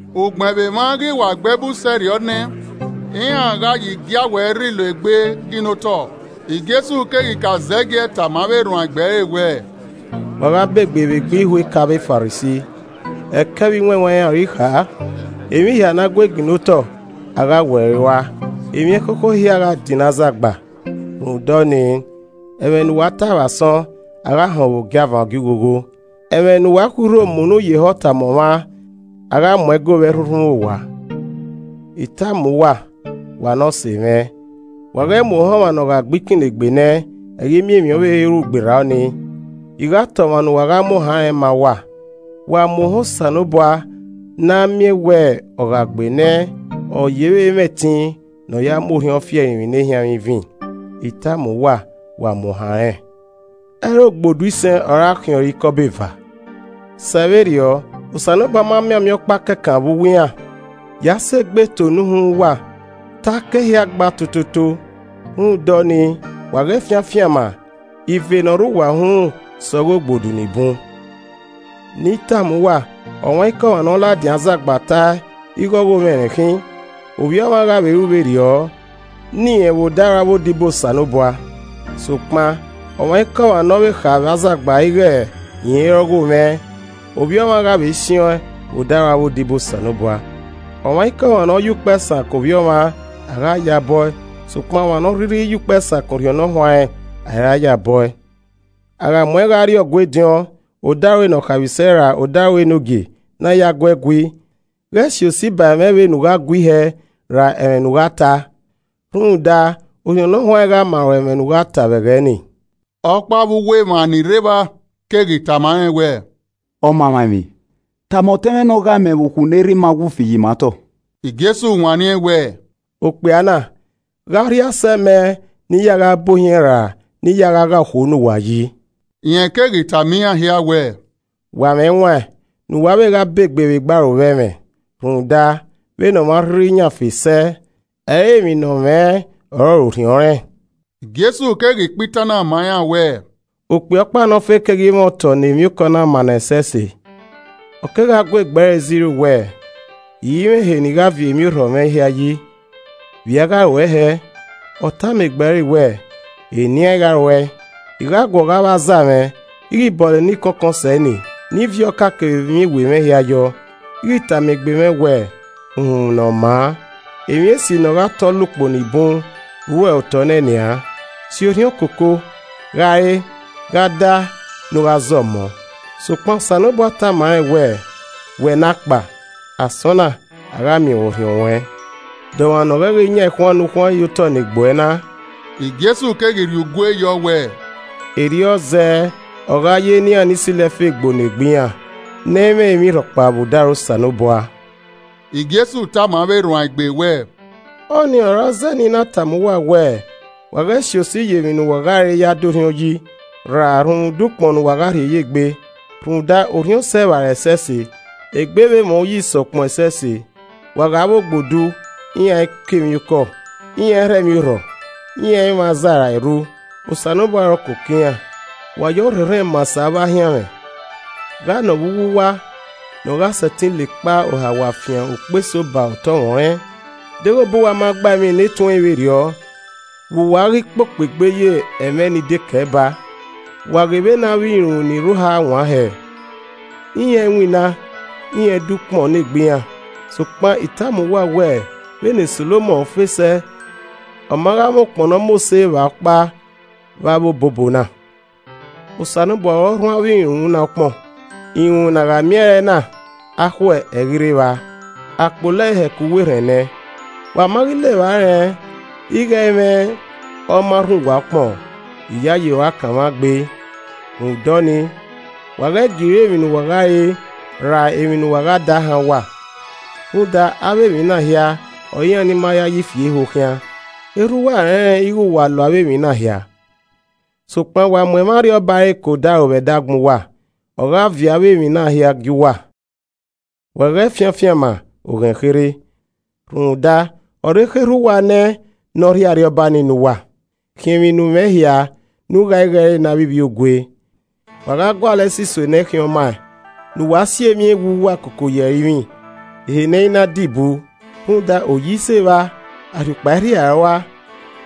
Ugbẹn vbe emwa ghi wa gbe ẹbu sẹrriọ ne iran gha ye igiawẹ rilo egbe ginna otọ, Jesu keghi ka zẹgiẹ tama avbe erhuanegbe ẹre wẹẹ, “Wa gha begbe vbe egbe ihueka avbe Farisi! Ẹkẹ vbe iwẹnwẹn iran ọre I kha. Emwi hia ne a gue ginna otọ, a gha we ẹre rua, emwi ẹkhokho hia gha dinna azagba. Rhunmwuda ọnii, ẹmwẹ ne uwa tae vbe asọn, a gha họn ẹn vbe ogiavan ogioghogho, ẹmwẹ ne uwa khui urho mu unu ye ehọ tama ọmwa, a gha mu ẹn go vbe ẹrhunrhun owa. “I tama uwa, wa ne ọse mwẹ, wa ghẹ mu ohan ọmwa ne ọ gha gbe ikinnegbe nẹ, ẹ i ghi miẹn emwi ọvbehe ru gberra ọnii. I gha ta ọmwa ne uwa gha a mu ohan rẹn ma uwa. Wa mu ohan Osanobua na a miẹn wẹ ọ gha gbe nẹ, ọ yevbe mwẹ ẹtin ne ọ ya mu orhiọn fi ẹrinmwi ne ehianmwẹ ivin. I tama uwa, wa mu ohan rẹn! “Ẹ i re ogbodu isẹn ọre a khiẹn ọre ikọbọ eva? Sẹ vberriọ, Osanobua ma mianmian ọkpa kẹkan vbe uwu iran. Ya sẹ egbe eto ne uhunmwu uwa, te a ka ehia gba tototo. Rhunmwuda ọnii wa ghẹ fian afianma, ive ne ọ re uwa uhunmwu sẹ ọghe ogbodu ni bun! “Ne I tama uwa, ọmwaikọmwa ne ọ ladian azagba tae ighe ọghomwẹ rẹn ikhin. Ovbi Ọmwa gha vbe ru vberriọ ne irẹn vbe odaro avbe odibo Osanobua. Sokpan ọmwaikọmwa ne ọ vbe kha vbe azagba ighe irẹn i re ọghomwẹ, Ovbi Ọmwa gha vbe siẹn ọẹn vbe odaro avbe odibo Osanobua. “Ọmwaikọmwa ne ọ ye ukpẹ sakan Ovbi Ọmwa, a gha ya bọe, sokpan ọmwa ne ọ rhirhi ya ukpẹ sakan Orhiọn Ne ọ huanrẹn, a i ra ya bọe. “A gha mu ẹn gha rrie Ọgua ediọn, odaro ne ọ khaemwisẹ ra odaro enogie ne a ya gu ẹe gui, ghẹ si osi ba ẹmwẹ vbene u gha gui hẹẹ ra ẹmwẹ ne u gha ta. Rhunmwuda, Orhiọn Ne Ọ Huanrẹn gha ma ruẹ ẹmwẹ ne u gha ta vbe ẹghẹ nii.” Ọkpa vbe uwu emwa ni rre evba keghi tama rẹn wẹẹ, “Ọmamwaemwi, tama ọtẹn mwẹ ne ọ ghae mẹ vbe ukhu ne erha ima wu fi ye ima otọ.” Jesu wanniẹn wẹẹ, “Ọkpia na, gha ọ rhie asẹ mẹ ne I ya gha bu ohiẹn ra ne I ya gha gha ukhu ne uwa yi?” Rẹn keghi tama iran hia wẹẹ, “Wa mwẹ ẹwaẹn ne uwa vbe gha ba egbe vbe egbe arovbẹmwẹ. Rhunmwuda, vbene ọmwa arhirhi yan fe sẹ, ẹ i re emwi ne ọ mwẹ ọrọre Orhiọn rẹn.” Jesu keghi kpa itan na ma iran wẹẹ, “Okpia ọkpa ne ọ fe keghi mwẹ otọ ne emwiokọ na maa nẹẹn ẹsẹse. Ọ kegha gu egbe ẹre zẹ iro wẹẹ, ‘I i mwẹ ehe ne I gha viọ emwiorhọ mwẹ hia yi, vbe I a gha ruẹe hẹẹ?’ Ọ tama egbe ẹre wẹẹ, ‘Enian I gha ruẹe. I gha guọghọ avbe aza mwẹ, I ghi bọlọ ni kọnkọn sẹ enii, ne I viọ ọka kevbe emwi ewe mwẹ hia yọọ. I ghi tama egbe mwẹ wẹẹ, Uhunmwu ne ọ maa! Emwi esi ne ọ gha tọ la ukpo ni bun rre uẹ otọ nẹ nian, si orhiọn koko, gha re, gha da ne u gha zọmọ!’ Sokpan Osanobua tama rẹn wẹẹ, ‘Wẹ ne akpa! Asọn na, a gha miẹn ruẹn orhiọn ruẹn. De ọmwa ne ọ ghẹ ghi yan ekhuan ne u khuan ye otọ ne egbe uẹ na.’” Jesu keghi rhie ugue yọ wẹẹ, “Erriọ zẹẹ ọ gha ye ne iran ni silo ẹfe gboo ne egbe iran, ne ẹ i mwẹ emwi rhọkpa vbe odaro Osanobua.” Jesu tama avbe erhuanegbe wẹẹ, “Ọnii ọre ọ zẹe ne I na tama uwa wẹẹ, wa ghẹ si osi ye emwi ne uwa gha re ya da orhiọn yi, ra rhunmwuda ukpọn ne uwa gha rhie ye egbe. Rhunmwuda orhiọn sẹ evbare ẹsẹse, egbe vbe mwẹ uyi sẹ ukpọn ẹsẹse. Wa ghe avbe ogbodu, iran i kọ emwi okọ, iran i rhọ emwi orhọ, iran i mwẹ aza ra erru, Osanobua ọre ọ koko iran. Wa ya ọrhẹnrhẹn maa sẹ avbe ahianmwẹ. Gha nọ vbe uwu uwa, ne ọ gha sẹtin la ekpa ohawa fian ukpo eso ba utọmwẹ ọnrẹn. Deghẹ obọ uwa ma gba emwi ne tuẹin vberriọ, vbe uwa ghi kpokpo egbe ye ẹmwẹ eni dekẹe baa? Wa ghe vbene avbe irunmwu ni rre oha wan hẹẹ. Iran i winna, iran i do ukpọn ne egbe iran. Sokpan I tama uwa wẹ vbene Solomọn fe sẹ, ọ ma gha mwẹ ukpọn ne ọ mose vba ọkpa vbe avbe obobo na. Osanobua ọre ọ rhuan avbe irunmwu na ukpọn, irunmwu ne a gha miẹn ẹre na, akhuẹ, ẹ i ghi rre evba, a kpolo ẹe hẹ ku uwu erhẹn nẹ. Wa ma ghi la evba rẹn ighe ẹ i mwẹ ọ ma rhuan uwa ukpọn. Iyayi rua kanmwa gbe. “Rhunmwuda ọnii, wa ghẹ gie iro emwi ne uwa gha re ra emwi ne uwa gha da han uwa. Rhunmwuda, avbe emwi na hia ọre iran ni ma yayi fie ho khian. Erha uwa rẹnrẹn ighe wa lo avbe emwi na hia. Sokpan wa mu ẹmwẹ Arriọba ẹre ke odaro vbe ẹdẹ agbọn uwa, ọ gha viọ avbe emwi na hia gie uwa. “Wa ghẹ fian afianma, oghẹn kherhe. Rhunmwuda, ọ re ekhọe Erha uwa nẹ ne ọ rhie Arriọba ni ne uwa. Khiẹn emwi ne u mwẹ hia ne u gha igho ẹre ne avbe ivbiogue. Wa gualọ ẹsiso ne ẹ i khian ọmaẹn, ne uwa si emwi ewe uwa koko ye ẹrinmwi, ehe ne ẹ i na dibu, rhunmwuda oyi i sẹ evba, arriukpa ẹ i rhia ẹe rua.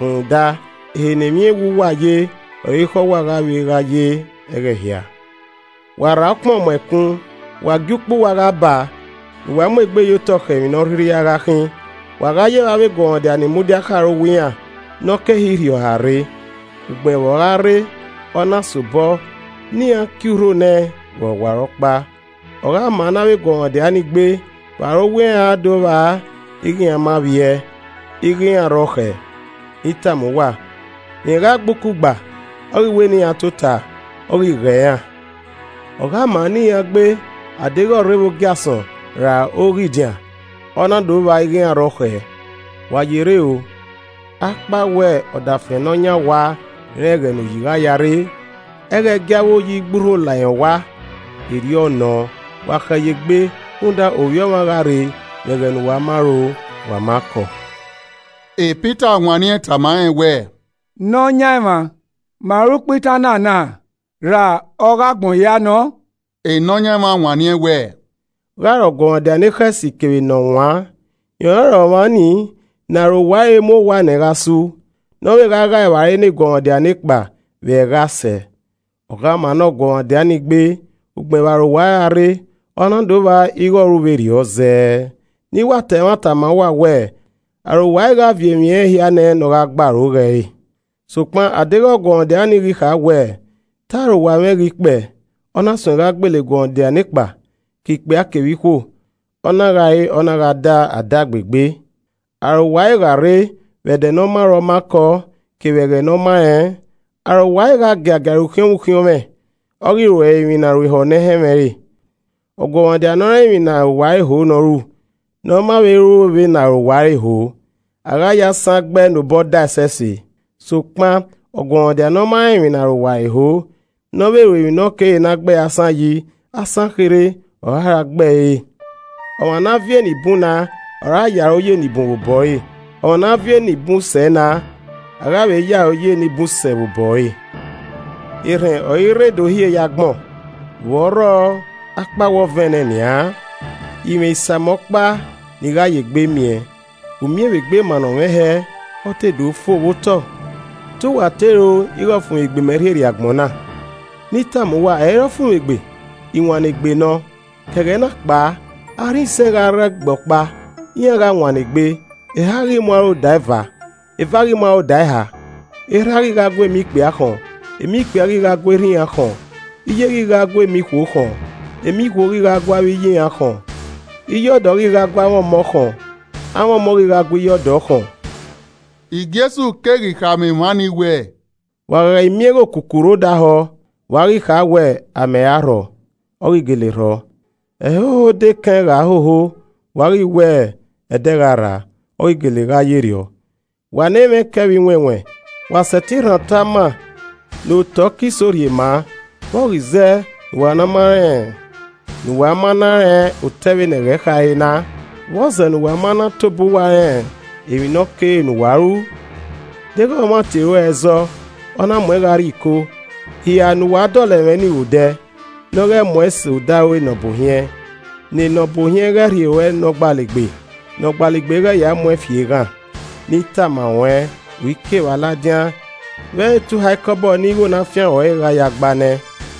Rhunmwuda ehe ne emwi ewe uwa ye ọre ekhọe uwa gha vbe gha ye ẹghẹ hia. “Wa rra ukpọn mu ẹkun, wa gie ukpa uwa gha baa, ne uwa mu egbe ye otọ khẹ emwi ne ọrhirhi a gha khin. Wa gha ye vbe avbe eguọmwadia ni mudia khẹ arowa iran ne ọ ke ehe irhiọha rre. Ugbẹn vbe ọ gha rre, ọ na sobọ, ne iran kie urho nẹẹn vbe ọwarọkpa. Ọ gha ma ne avbe eguọmwadia ni gbe vbe arowa iran aa do vba ighe iran ma vbiẹ, ighe iran re ọkhẹ. Ne I tama uwa, rẹn gha gba ukugba, ọ ghi wẹ ne iran tota, ọ ghi gho iran. Ọ gha ma ne iran gbe a deghẹ ọ rre vbe ogiasọn ra oghidian ọ na do vba ighe iran rre ọkhẹ. Wa ye rre o, akpawẹ ọdafẹn ne ọ yan owa rẹn ẹghẹ ne oyi gha ya rre, ẹ i ghẹ gie avbe oyi gbe urho la irẹn owa. Erriọ nọ, wa khẹ ye egbe rhunmwuda Ovbi Ọmwa gha rre vbe ẹghẹ ne uwa ma ro wa ma kọọ.” Pita wanniẹn tama rẹn wẹẹ, “Nọyaẹnmwa, ma ọre u kpa itan na na ra ọghe agbọn hia nọ?” Nọyaẹnmwa wanniẹn wẹ, “Gha ọre ọguọmwadia ne ekhọe esi kevbe ne ọ waan? Rẹn ọrọre ọmwa ni ne arowa ẹre mu owa nẹẹn gha su, ne ovbe gha ghae evbare ne eguọmwadia ne kpa vbe ẹghẹ a sẹ. Ọ gha maa ne ọguọmwadia ni gbe ugbẹn vbe arowa ẹre a rre, ọ na do vba ighe ọ ru vberriọ zẹẹ. Ne I wa ta ẹmwata ma uwa wẹẹ, arowa ẹre gha viọ emwi ẹnrẹn hia nẹẹn ne ọ gha gbe aro ghe ẹre. Sokpan a deghẹ ọguọmwadia nii ghi kha wẹẹ, ‘Te arowa mwẹ ghi kpẹe,’ ọ na suẹn gha gbele eguọmwadia nekpa, ke ikpia kevbe ikhuo, ọ na gha re, ọ na gha da, a da gbe egbe. Arowa ẹre gha rre vbe ẹdẹ ne ọ ma ro ọ ma kọ, kevbe ẹghẹ ne ọ ma rẹn. Arowa ẹre gha giagia ẹre ukhiọnmwẹ ukhiọnmwẹ, ọ ghi ru ẹre emwi ne a ru ehọ ne ẹ i họn ẹmwẹ re. “Ọguọmwadia ne ọ rẹn emwi ne arowa ẹre ho ne ọ ru, ne ọ ma vbe ru vbene arowa ẹre ho, a gha ye asan gbe ẹe ne obọ dae ẹsẹse. Sokpan ọguọmwadia ne ọ ma rẹn emwi ne arowa ẹre ho, ne ọ vbe ru emwi ne ọ kere ne a gbẹe asan yi, asan kherhe ọre a ra gbe ẹre re. Ọmwa ne a viọ ni bun na ọre a ye aro ye enibun vbe obọ ẹre, ọmwa ne a viọ ni bun sẹ na, a gha vbe ye aro ye ni bun sẹ vbe ohọ ẹre. “Erhẹn ọre I rre do hie ye agbọn, vbọ rrọọ akpawẹ ọ vẹn nẹ nian? I mwẹ isamẹ ọkpa ne I gha yegbe miẹn. U miẹn vbe egbe mannọ mwẹ hẹẹ, ọ te do fo vbe otọ! Te uwa te ro ighẹ ọfumwegbe mẹ rhie rrie agbọn na? Ne I tama uwa, ẹ i re ọfumwegbe, iwannegbe nọ. Ke ẹghẹ na kpao, arhin isẹn gha rre ẹgbẹe ọkpa, iran gha wannegbe, eha ghi mu aro da eva, eva ghi mu aro da eha. Erha ghi gha gu emọ ikpia khọn, emọ ikpia ghi gha gu erha iran khọn. Iye ghi gha gu emọ ikhuo khọn, emọ ikhuo ghi gu avbe iye iran khọn. Iye ọdọ ghi gha gu amwẹ ọmọ khọn amwẹ ọmọ ghi gha gu iye ọdọ khọn.” Jesu keghi khama emwa ni wẹẹ, “Wa gha miẹn ighẹ okuku rre odẹ ahọ, wa ghi kha wẹ, ‘Amẹ ra rhọ,’ ọ ghi gele rhọ. Ẹhoho odẹ ekẹn gha hoho, wa ghi wẹ, ‘Ẹdẹ gha rraa,’ ọ ghi gele gha yerriọ. Wa ne emwa ẹkẹ vbe iwẹnwẹn, wa sẹtin rhan otọ ama ne otọ ke iso rhie maa, vbe ọ ghi zẹ ne uwa ma na rẹn otọ vbene ẹghẹ khare na? “Vbọzẹ ne uwa ma na tobọ uwa rẹn emwi ne ọ kere ne uwa ru? Deghẹ ọmwa tie ruẹ ẹzọ, ọ na muẹn gha rrie iko, hia ne uwa dọlọ ẹmwẹ nii vbe odẹ, ne ọ ghẹ mu uẹn sẹ odaro enọbuohiẹn, ne enọbuohiẹn ghẹ rhie ruẹ ne ọgbalegbe, ne ọgbalegbe ghẹ ya mu ẹn fi eghan. Ne I tama ruẹn, u i ke evba ladian vbe ẹ i re te u ha ikọbọ ne igho ne a fian ruẹn re gha ya gba nẹ.”